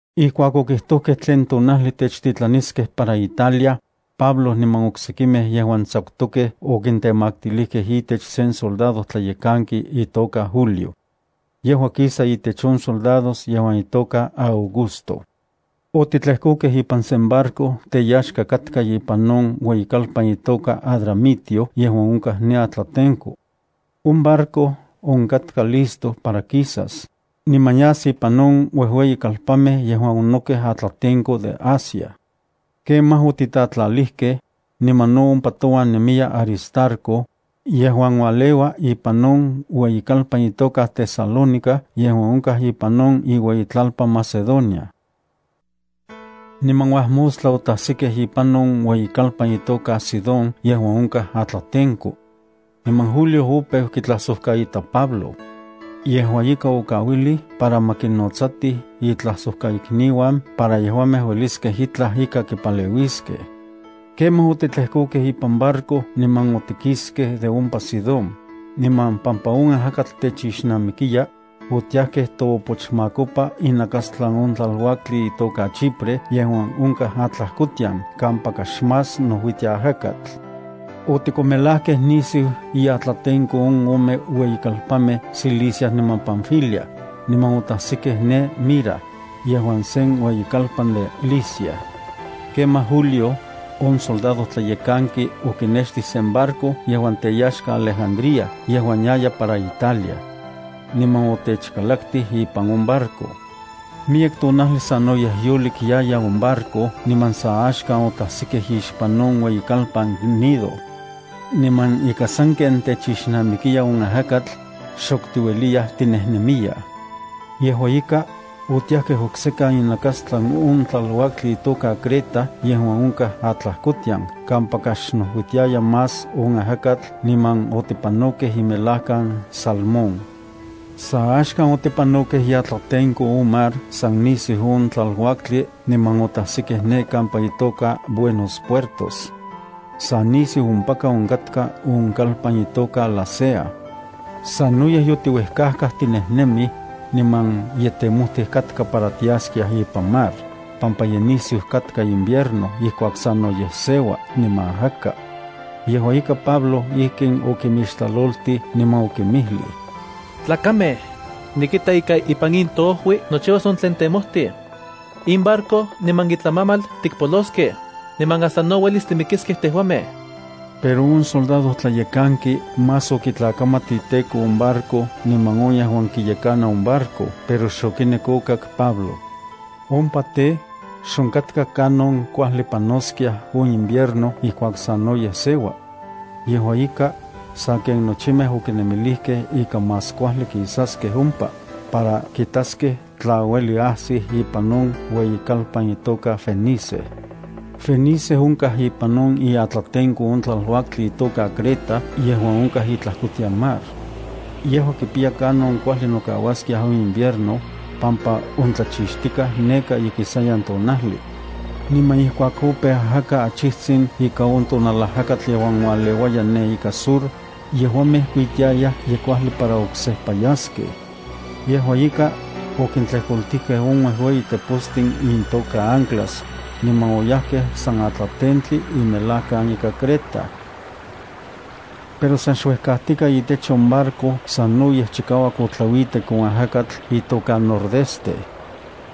Ijkuak okijtojkej tlen tonajli techtitlaniskej para Italia, Pablo niman oksekimej yejuan tsakutokej okintemaktilijkej itech sen soldadojtlayekanki itoka Julio. Yejua kisa itech on grupo de soldados yejuan itoka Augusto. Otitlekokej ipan sen barco teyaxka katka ipan on ueyikalpan itoka Adramitio yejuan onkaj ne atlatenko. On barco onkatka listo para kisas, niman yas ipan on uejueyikalpanmej onokej atlatenko de Asia. Kemaj otitatlalijkej, niman no ompa touan nemiya Aristarco, yejuan ualeua ipan on ueyikalpan itoka Tesalónica yejuan onkaj ipan on iueyitlalpan Macedonia. Niman uajmostla otajsikej ipan on ueyikalpan itoka Sidón yejuan onkaj atlatenko. Niman Julio opeu kitlajsojkaita Pablo. Yejua ika, okauilij para ma kinnotsati itlajsojkaikniuan para yejuamej ueliskej itlaj ika kipaleuiskej. Kemaj otitlejkokej ipan barco niman otikiskej de ompa Sidón, niman pampa on ajakatl techixnamikiya, otiajkej toopochmakopa inakastlan on tlaluaktli itoka Chipre yejuan onkaj atlajkotian kampaka xmás nojuitia ajakatl. Otikonmelajkej nisiu iatlatenko on ome ueyitlalpanmej Cilicia niman Panfilia, niman otajsikej ne Mira, yejuan sen ueyikalpan de Licia. Kemaj Julio, on soldadojtlayekanki, okinextij sen barco yejuan teyaxka Alejandría yejuan yaya para Italia. Niman otechkalaktij ipan on barco. Miyek tonajli sanoyej yolik yaya on barco niman sa axkan otajsikej ixpan on ueyikalpan Gnido. Niman ika sanken techixnamikiya on ajakatl, xok tiueliyaj tinejnemiyaj. Yejua ika, otiajkej oksekan inakastlan on tlaluaktli itoka Creta yejuan onkaj atlajkotian kampaka xnojuitiayaj más on ajakatl niman otipanokej imelajkan Salmón. Sa axkan otipanokej iatlatenko on mar san nisiu on tlaluaktli niman otajsikej ne kampa itoka Buenos Puertos. Sa nisiu ompaka onkatka on kalpan itoka Lasea. Sanoyej yotiuejkajkaj tinejnemij, niman ye temojtij katka para tiaskiaj ipan mar, pampa ye nisiu katka on invierno ijkuak sanoyej seua niman ajaka. Yejua ika, Pablo ijkin okinmixtlaloltij niman okinmijlij: —Tlakamej, nikita ika ipan in toojui nochiuas on tlen temojtij. In barco niman itlamamal tikpoloskej, niman hasta no uelis timikiskej tejuamej. Pero on soldadojtlayekanki más okitlakamat iteko on barco niman on yejuan kiyekana on barco pero xokinek okak Pablo. Ompa tej, xonkatka kanon kuajli panoskiaj on invierno ijkuak sanoyej seua. Yejua ika, sa ken nochimej okinemilijkej ika más kuajli kisaskej ompa, para kitaskej tla uelij ajsij ipan on ueyikalpan itoka Fenice. Fenice onkaj ipan on iatlatenko on tlaluaktli itoka Creta yejuan onkaj itlajkotian mar. Yejua kipiya kanon kuajli nokauaskiaj on invierno, pampa on tlachixtikaj neka ikisayan tonajli. Niman ijkuak opeu ajaka achijtsin ika on tonalajakatl yejuan ualeuaya ne ika sur, yejuamej kuitiayaj ye kuajli para oksejpa yaskej. Yejua ika, okintlejkoltijkej on uejueyi tepostin intoka anclas, niman oyajkej san atlatentli imelajkan ika Creta. Pero san xuejkajtikaj itech on barco sanoyej chikauak otlauitek on ajakatl itoka Nordeste.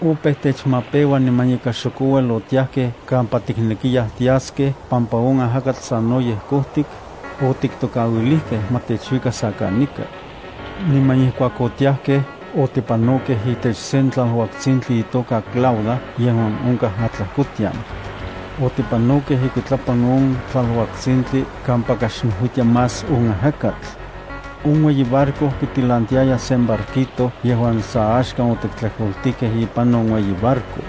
Opeu techmapeua niman ika xok ouel otiajkej kampa tiknekiyaj tiaskiaj pampa on ajakatl sanoyej kojtik, otiktokauilijkej ma techuika sa kanika. Niman ijkuak otiajkej otipanokej itech sen tlaluaktsintli itoka Clauda yejuan onkaj atlajkotian. Otipanokej ikuitlapan on tlaluaktsintli kampaka xnojuitia más on ajakatl. On ueyi barco kitilantiaya sen barquito yejuan sa axkan otiktlejkoltijkej ipan on ueyi barco.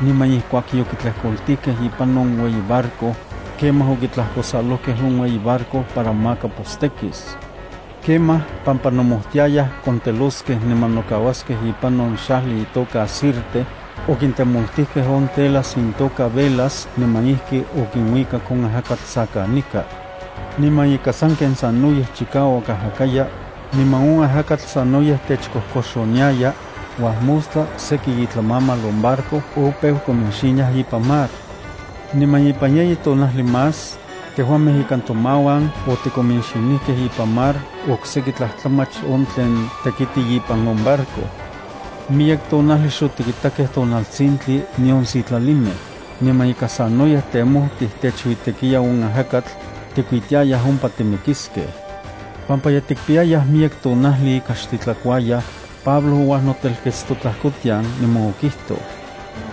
Niman ijkuak yokitlejkoltijkej ipan on ueyi barco, kemaj okitlajkosalojkej on ueyi barco para maka postekis. Kemaj pampa nomojtiayaj konteloskej niman nokauaskej ipan on xajli itoka Sirte, okintemoltijkej on telas intoka velas niman ijki okinuikak on ajakatl sa kanika. Niman ika sanken sanoyej chikauak ajakaya, niman on ajakatl sanoyej techkojkoxoniaya, uajmostla seki itlamamal on barco opeu kominxiniaj ipan mar. Niman ipan yeyi tonajli más, tejuamej ikan tomauan otikominxinijkej ipan mar okseki tlajtlamach on tlen tekiti ipan on barco. Miyek tonajli xotikitakej tonaltsintli nion sitlalimej, niman ika sanoyej temojtij techuitekiya on ajakatl, tikuitiayaj ompa timikiskiaj. Pampa ye tikpiyayaj miyek tonajli ika xtitlakuayaj, Pablo ouajnotelkets totlajkotian niman okijtoj: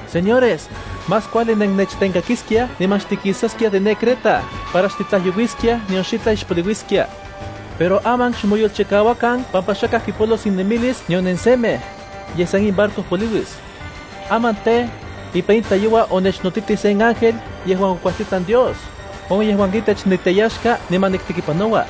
—Señores, más kuajli nennechtenkakiskiaj niman xtikisaskiaj de ne Creta para xtitlajyouiskiaj nion xitlaj ixpoliuiskia. Pero aman, xmoyolchikauakan pampa xakaj kipolos inemilis nion nensemej, yej san in barco poliuis. Aman tej, ipan in tlayoua onechnotitij sen ángel yejuan okuajtitlan Dios, on yejuan itech niteyaxka niman niktekipanoua.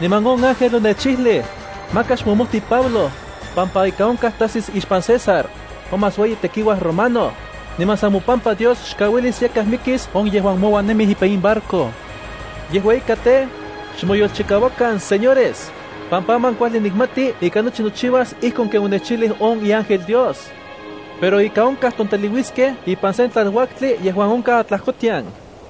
Niman on ángel onechijlij: “Maka xmomojti Pablo, pampa ika onkaj tajsis ixpan César, on más ueyi tekiuaj romano, niman san mopampa Dios xkauilis yakaj mikis on yejuan mouan nemij ipan in barco.” Yejua ika tej, xmoyolchikauakan, señores, pampa aman kuajli nikmati ika nochi nochiuas ijkon ken onechijlij on iángel Dios. Pero ika onkaj tonteliuiskej ipan sen tlaluaktli yejuan onkaj atlajkotian.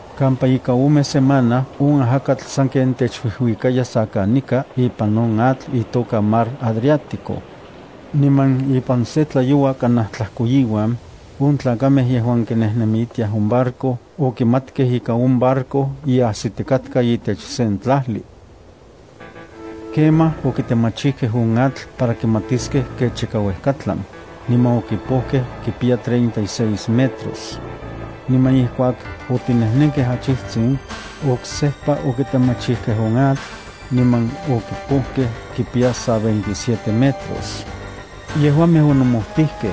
Kampa ika ome semana on ajakatl sanken techuijuikaya sa kanika ipan on atl itoka Mar Adriático. Niman ipan se tlayoua kanaj tlajkoiuan, on tlakamej yejuan kinejnemiltiaj on barco okimatkej ika on barco ye ajsitikatka itech sen tlajli. Kemaj okitemachijkej on atl para kimatiskej kech ika uejkatlan, niman okipojkej kipiya treinta y seis metros. Niman ijkuak otinejnenkej achijtsin, oksejpa okitemachijkej on atl, niman okipojkej kipiya san veintisiete metros. Yejuamej onomojtijkej,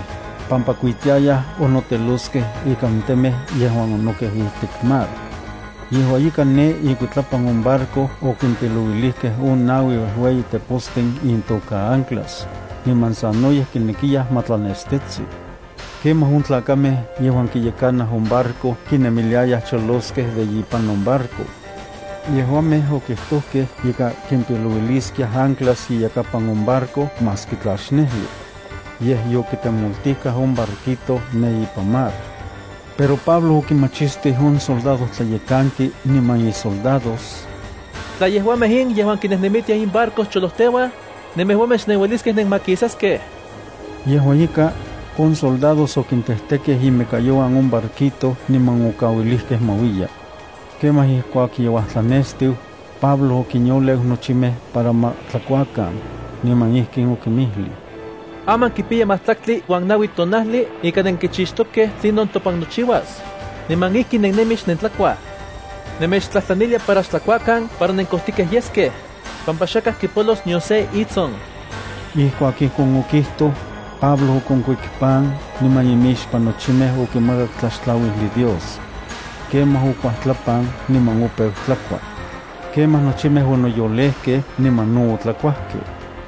pampa kuitiayaj onoteloskej ikan temej yejuan onokej ijtik mar. Yejua ika ne ikuitlapan on barco okimpilouilijkej on naui uejueyi tepostin intoka anclas, niman sanoyej kinekiyaj ma tlanestetsi. Kemaj on tlakamej yejuan kiyekanaj on barco kinemiliayaj choloskej de ipan on barco. Yejuamej okijtojkej ika kimpilouiliskiaj anclas iyakapan on barco maski tla xnejli. Yej yokitemoltijkaj on barquito ne ipan mar. Pero Pablo okimachistij on soldadojtlayekanki niman isoldados: —Tla yejuamej in yejuan kinejnemitiaj in barco choloteuaj, nemejuamej xnenueliskej nenmakisaskej. Yejua ika, on soldados okintejtekej imekayouan on barquito niman okauilijkej ma uiya. Kemaj ijkuak ye uajtlanestiu, Pablo okinyoleu nochimej para ma tlakuakan, niman ijkin okinmijlij: —Aman kipiya majtlaktli uan naui tonajli ika nenkichixtokej tlinon topan nochiuas, niman ijki nennemij xnentlakuaj. Nemechtlajtlanilia para xtlakuakan para nenkojtikej yeskej, pampa xakaj kipolos nion se itson. Ijkuak ijkon okijtoj, Pablo okonkuik pan niman imixpan nochimej okimakak tlaxtlauijli Dios. Kemaj okuajtlapan niman opeu tlakua. Kemaj nochimej onoyolejkej niman no otlakuajkej.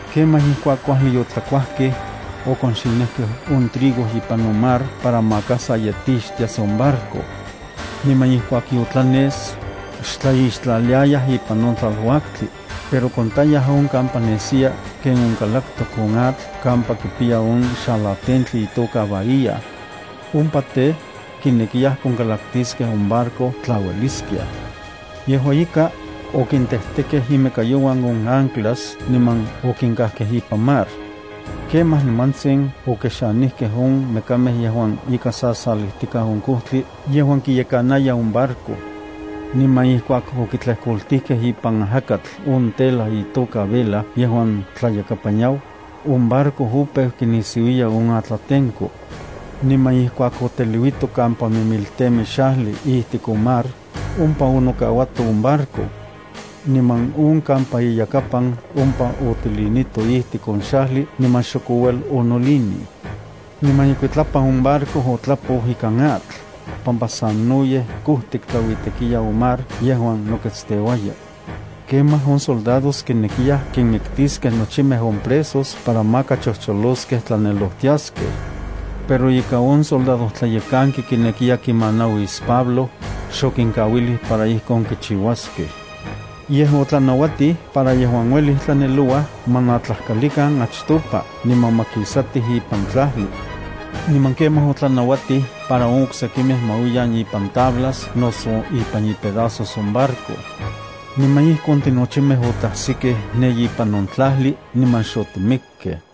Kemaj ijkuak kuajli yotlakuajkej, okonxinijkej on trigo ipan on mar para maka sa yetixtias on barco. Niman ijkuak yotlanes, xtlaixtlaliayaj ipan on tlaluaktli, pero kontayaj on kampa nesiya ken onkalaktok on atl kampa kipiya on xalatentli itoka bahía. Ompa tej, kinekiyaj konkalaktiskej on barco tla ueliskiaj. Yejua ika, okintejtekej imekayouan on anclas niman okinkajkej ipan mar. Kemaj nimantsin okexanijkej on mekamej yejuan ika sasalijtikaj on kojtli a yejuan kiyekanaya on barco. Niman ijkuak okitlejkoltijkej ipan ajakatl on tela itoka vela yejuan tlayakapan yau, on barco opeu kinisiuiya on atlatenko. Niman ijkuak oteliuito kampa mimiltemi xajli ijtik on mar, ompa onokauato on barco. Niman on kampa iyakapan ompa otilinito ijtik on xajli niman xok ouel onolinij. Niman ikuitlapan on barco otlapou ikan atl, pampa sanoyej kojtik tlauitekiya on mar yejuan noketsteuaya. Kemaj on soldados kinekiyaj kinmiktiskej nochimej on presos para maka chojcholoskej tlanelojtiaskej. Pero ika on soldadojtlayekanki kinekiya kimanauis Pablo, xokinkauilij para ijkon kichiuaskej. Yej otlanauatij para yejuan uelij tlanelouaj ma natlajkalikan achtopa niman ma kisatij ipan tlajli. Niman kemaj otlanauatij para on oksekimej ma uiyan ipan tablas noso ipan ipedasos on barco. Niman ijkon tinochimej otajsikej ne ipan on tlajli niman xotimikkej.